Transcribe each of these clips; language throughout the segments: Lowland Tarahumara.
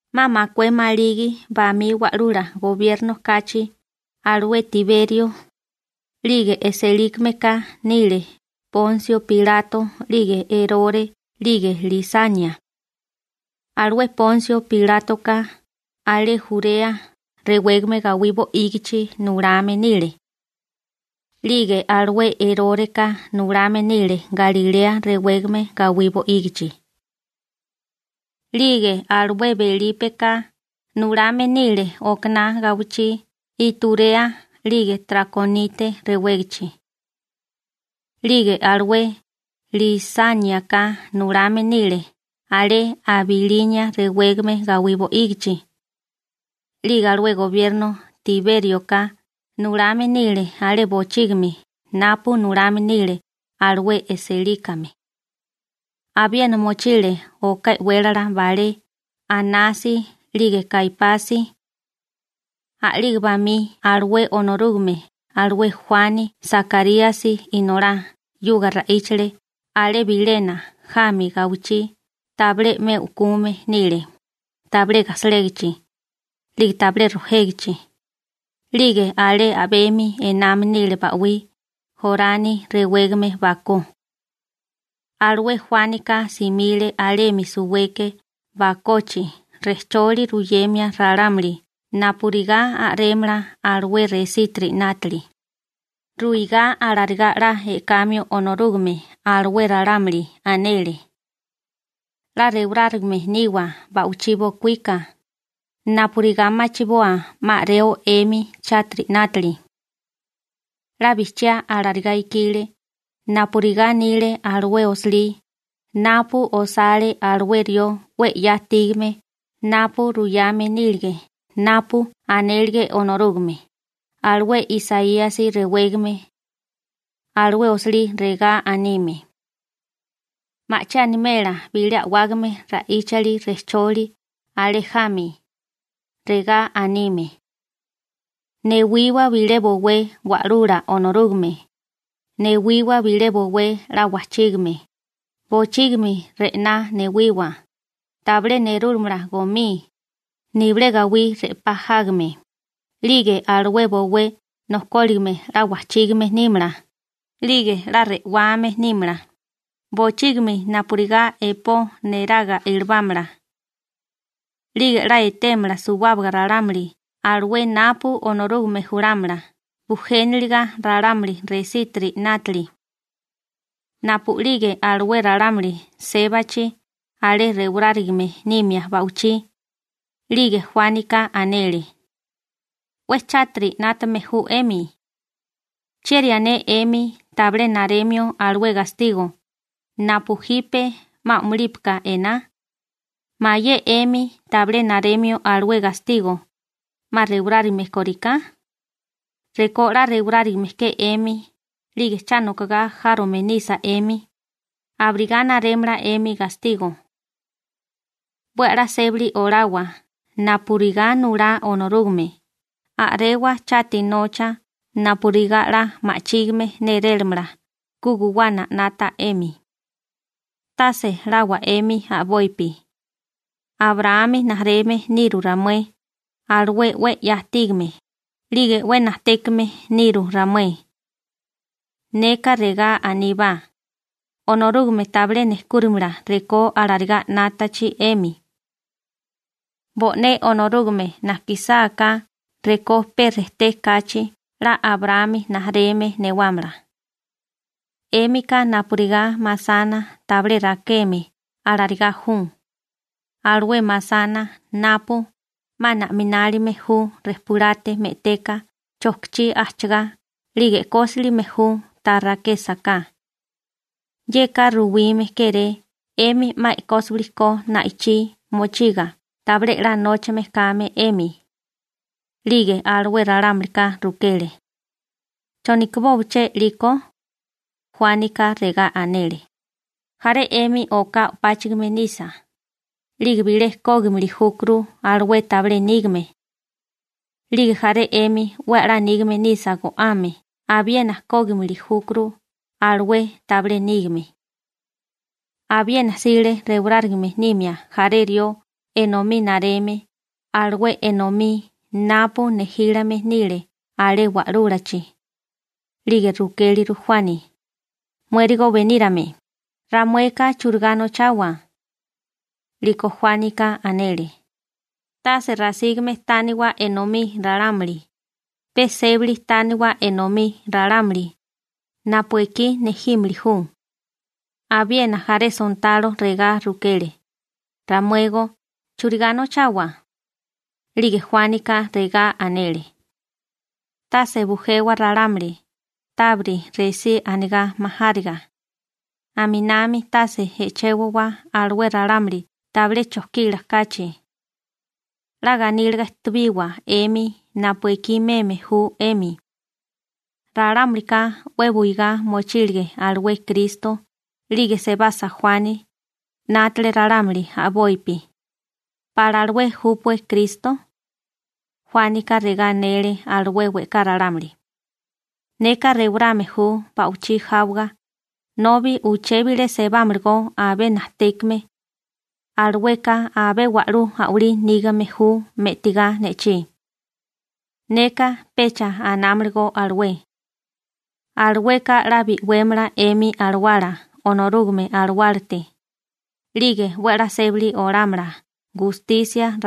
'Ma makué maligi bamí wa'lula gobierno kachi alué Tiberio, 'lige e'sélikameka nile Ponsio Pilato 'lige Erore 'lige Lisania. Alué Ponsio Pilátoka alé Jurea rewégame gawí bo'ígichi nulame nile. 'Lige alué Eróreka nulame nile Galilea rewégame gawí bo'ígichi. 'Lige alué Belípeka nulame nile okaná gawichí Iturea 'lige Trakonite rewégachi. 'Lige alué Lisániaka nulame nile alé Abilinia rewégame gawí bo'ígichi. 'Lige alué gobierno Tibérioka nulame nile alé bochígimi napu nulame nile alué e'sélikame. Abiena mochile oká e'wélala balé Anasi 'lige Kaipasi. A'lige bamí alué Onorúgame alué Juani Sakaríasi inolá 'yuga ra'íchale alé bilénami jami gawichí tabilé 'me u'kume nile, tabilé gasalégichi, 'lige tabilé rojégichi, 'lige alé a'bemi ename nile ba'wí Jorani rewégame bakó. Alué Juánika simile alemi suweke bakochi rejcholi ruyemia ralámuli napurigá a'rémala alué resítiri 'nátili, ruigá alarigá 'la e'kamio Onorúgame alué ralámuli. Anele: ―'La rewarárigame niwa ba'wichí bokuíka napurigá machiboa 'ma a'reo 'emi chátiri 'nátili. 'La bijchiá alarigá ikile napurigá anile alué osilí napu osale alué rió 'we 'ya ajtígame napu ruyame nílige napu anélige Onorúgame, alué Isaíasi rewégame. Alué osilí regá anime: Ma'chí animela bilé a'wágame ra'íchali rejcholi alé jami, regá anime: ‹‹Newiwa bilé bowé Wa'lula Onorúgame, newiwa bilé bowé 'la wajchígame, Bochígimi re'ná newiwa, tabilé nerúlamala gomí, nibilé gawí re'pá jágame, 'lige alué bowé nojkóligime 'la wajchígame nímala, 'lige 'la re'wame nímala, bochígimi napurigá epó neraga ilibámala. 'Lige 'la etémala suwábaga ralámuli alué napu Onorúgame julámala bujéniliga ralámuli resítiri 'nátili.›› Napu'lige alué ralámuli sébachi alé rewarárigame nimia ba'wichí, 'lige Juánika anele: ―'We chátiri 'nátame ju 'emi. ¿Chieri ané 'emi tabilé naremio alué gastigo napu jipe 'ma a'mulípika ená? ¿Mayé 'emi tabilé naremio alué gastigo 'ma rewarárigame kóriká? Rekó 'la rewarárigame ke 'emi 'lige cha nokogá járome nisa 'emi, abirigá narémala 'emi gastigo. 'We a'lá sébali olawa napurigá nulá Onorúgame, a'rewa chati nocha napurigá 'la ma'chígime nérélamala ku guwana 'nata 'emi. Tase lawa 'emi a'bopi: «Abraámi rijimala niru ramué, alué 'we 'ya ajtígame, 'lige 'we najtékame niru ramué.» Neka regá aníbá: Onorúgame tabilé nejkúrimala rekó alarigá 'nátachi 'emi. Bo'né Onorúgame najkisáká rekó pe rejté kachi 'la Abraámi rijimala newámala. 'Émika napurigá masana tabilé rakeme alarigá ju, alué masana napu 'ma na'minálime ju rejpulate me'teka chojkichí ajchagá 'lige e'kósilime ju ta rakésaká. Yeka ruwime kéré 'emi 'ma e'kósiwili ko na'ichí mochiga tabilé 'la nóchame kame 'emi. 'Lige alué ralámulika rukele: ―¿Cho nokibóché 'liko? Juánika regá anele: ―Jaré 'emi oká o'páchigime nisa, 'lige bilé kógimili júkuru alué tabilé nígame. 'Lige jaré 'emi 'we 'la nígame nisa go'ame abiena kógimili júkuru alué tabilé nígame. Abiena jsile rewarárigame nimia jaré rió enomí nareme alué enomí napu nejílame nile alé wa'lúlachi, 'lige rukéliru Juani: ―Muérigo benírame, ¿ramueka churigá nochawa? 'Liko Juánika anele: ―Tase rasígame tániwa enomí ralámuli, pe sébali tániwa enomí ralámuli napu ekí nejímili ju. Abiena jaré sontalo regá rukele: ―Ramuégó ¿churigá nochawa? 'Lige Juánika regá anele: ―Tase bujewa ralámuli tábiri resí anigá majáriga, aminami tase e'chewawa alué ralámuli tabilé chojkila kachi. 'La ganíliga ejtebiwa 'emi napu ekí meme ju 'emi. Ralámulika 'we buigá mochílige alué Kristo, 'lige sebasa Juani 'nátale ralámuli a'bopi: «¿Pala alué júpué Kristo?» Juánika regá anele alué we'ká ralámuli: ―Neka rewarame ju ba'wichí jáwaga, nobi uché bilé sebámalagó abé najtékame. Alueka abé wa'lú a'walí nígame ju me'tagá ne'chí. Neka pecha anámalagó alué. Alueka 'la bi'wémala 'emi alawala Onorúgame Alawálate, 'lige 'we a'lá sébali olámala gustisia.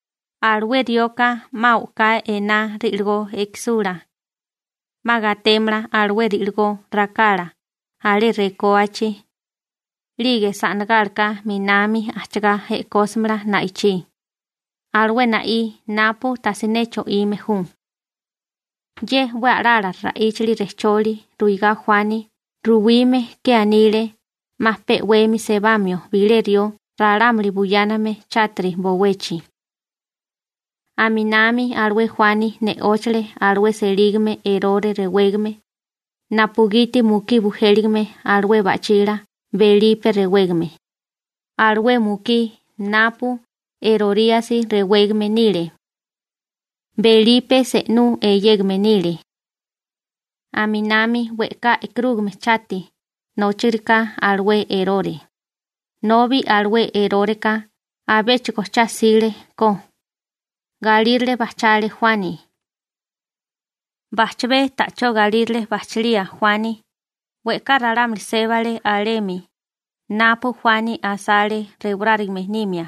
Alué rioka 'ma o'ká ená ri'ligó ekisula. 'Ma gatémala alué ri'ligó rakala alé rekóachi, 'lige sa'nagálaka 'minami ajchagá e'kósimala na'ichí, alué na'í napu tasiné cho'ime ju. Ye 'we a'lala ra'íchali rejcholi ruigá Juani ruwime ke anile 'ma pe 'wemi sebamio bilé rió ralámuli buyáname chátiri bowechi. Aminami alué Juani ne'óchale alué selígame Erore rewégame napugiti mukí bujéligame alué ba'chila Belipe rewégame, alué mukí napu Eroríasi rewégame nile. Belipe se'nú eyégame nile. Aminami we'ká e'karúgame chati nóchigariká alué Erore, nobi alué Eróreka abéchigo cha 'sile ko, galírale bajchale Juani. Bajchabé ta'chó galírale bajchilichi Juani, we'ká ralámuli sébale alemi napu Juani asale rewarárigame nimia,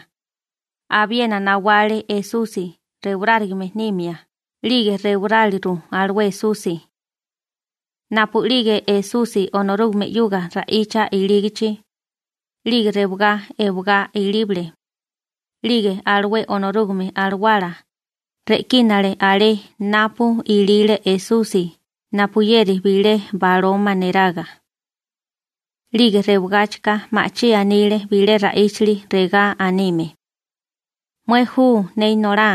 abiena nawale Esusi rewarárigame nimia 'lige rewaráliru alué Esusi. Napu'lige Esusi Onorúgame 'yuga ra'icha ilígachi, 'lige rewagá ewagá ilíbale, 'lige alué Onorúgame Alawala re'kínale alé napu ilile Esusi napuyeri bilé baloma neraga. 'Lige rewagáchika ma'chí anile bilé ra'íchali regá anime: ―Mué ju ne Inolá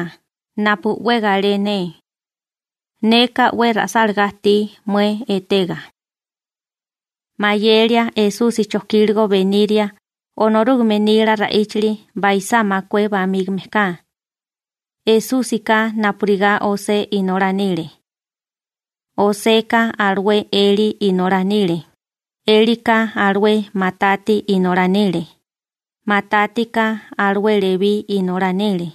napu 'we galé ne. Neka 'we ra'sálagá ajtí mué etega. Mayelia Esusi chojkíligo beniria Onorúgame nila ra'íchali baisá makué bamígame ka. Esúsika napurigá José inolá nile. Joseka alué Elí inolá nile. Elika alué Matati inolá nile. Matátika alué Lebí inolá nile.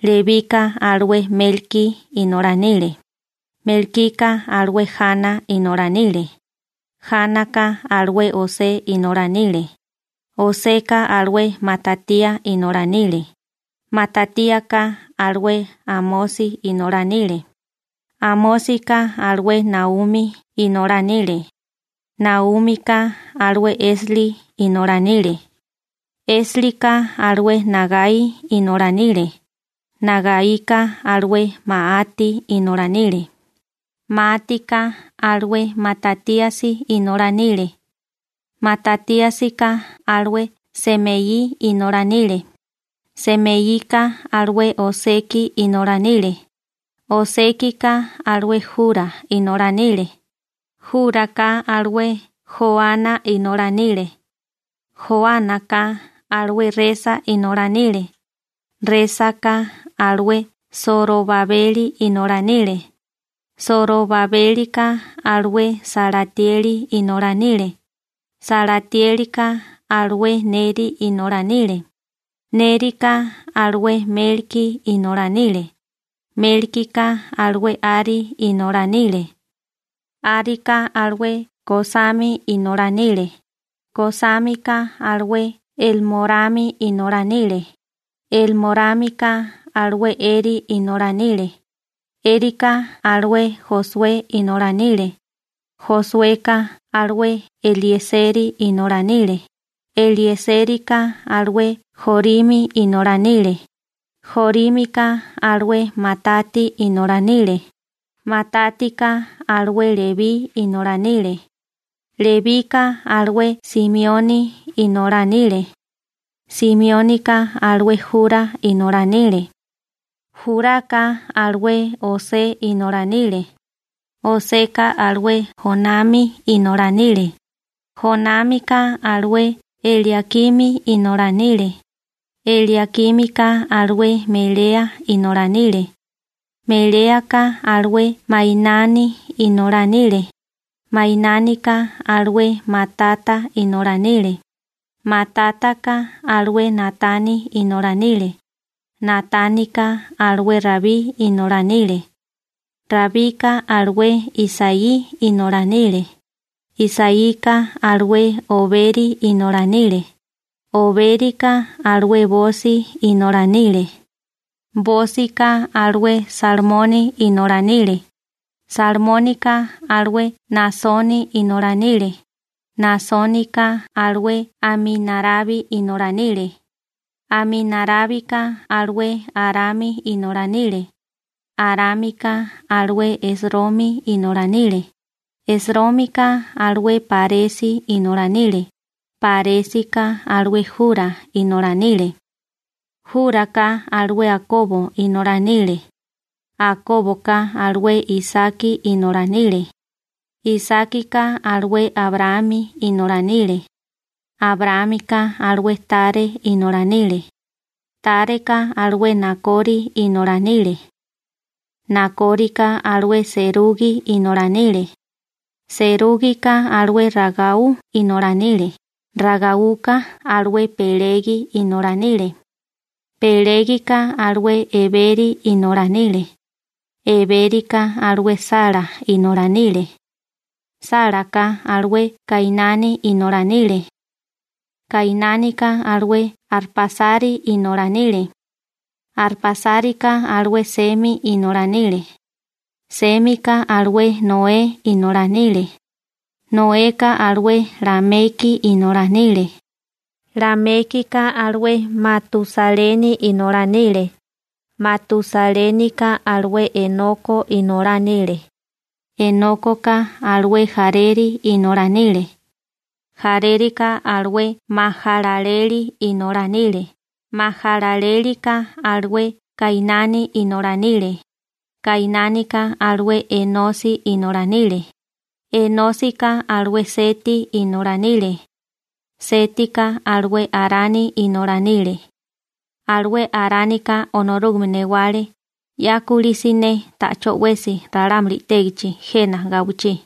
Lebika alué Melkí inolá nile. Melkika alué Jana inolá nile. Jánaka alué José inolá nile. Joseka alué Matatía inolá nile. Matatíaka alué Amosi inolá nile. Amósika alué Naumi inolá nile. Naúmika alué Esli inolá nile. Eslika alué Nagaí inolá nile. Nagaíka alué Maati inolá nile. Máatika alué Matatíasi inolá nile. Matatíasika alué Semeí inolá nile. Semeíka alué Oseki inolá nile. Osékika alué Jurá inolá nile. Juraka alué Joana inolá nile. Joánaka alué Resa inolá nile. Résaka alué Sorobabeli inolá nile. Sorobabélika alué Salatieli inolá nile. Salatiélika alué Neri inolá nile. Nérika alué Melkí inolá nile. Melkika alué Ari inolá nile. Árika alué Kosami inolá nile. Kosámika alué Elmorami inolá nile. Elmorámika alué Eri inolá nile. Erika alué Josué inolá nile. Josueka alué Elieseri inolá nile. Eliesérika alué Jorimi inolá nile. Jorímika alué Matati inolá nile. Matátika alué Lebí inolá nile. Lebika alué Simioni inolá nile. Simiónika alué Jurá inolá nile. Juraka alué José inolá nile. Joseka alué Jonami inolá nile. Jonámika alué Eliakimi inolá nile. Eliakímika alué Melea inolá nile. Meléaka alué Mainani inolá nile. Mainánika alué Matata inolá nile. Matátaka alué Natani inolá nile. Natánika alué Rabí inolá nile. Rabika alué Isaí inolá nile. Isaíka alué Oberi inolá nile. Obérika alué Bosi inolá nile. Bósika alué Salmoni inolá nile. Salmónika alué Naasoni inolá nile. Naasónika alué Aminarabi inolá nile. Aminarábika alué Arami inolá nile. Arámika alué Esromi inolá nile Esrómika alué Páresi inolá nile. Páresika alué Jurá inolá nile. Juraka alué Akobo inolá nile. Akóboka alué Isaki inolá nile. Isákika alué Abraámi inolá nile. Abraámika alué Taré inolá nile. Tareka alué Nakori inolá nile. Nakórika alué Serugi inolá nile. Serúgika alué Ragau inolá nile. Ragáuka alué Pelegi inolá nile. Pelégika alué Eberi inolá nile. Ebérika alué Sala inolá nile. Sálaka alué Kainani inolá nile. Kainánika alué Arpásari inolá nile. Arpásarika alué Semi inolá nile. Sémika alué Noé inolá nile. Noeka alué Lameki inolá nile. Lamékika alué Matusaleni inolá nile. Matusalénika alué Enoko inolá nile. Enókoka alué Jareri inolá nile. Jarérika alué Majalaleli inolá nile. Majalalélika alué Kainani inolá nile. Kainánika alué Enosi inolá nile. Enósika alué Seti inolá nile. Sétika alué Arani inolá nile. Alué Aránika Onorúgame newale 'ya kulí siné ta'chó 'wesi ralámuli i'tégichi jena gawichí.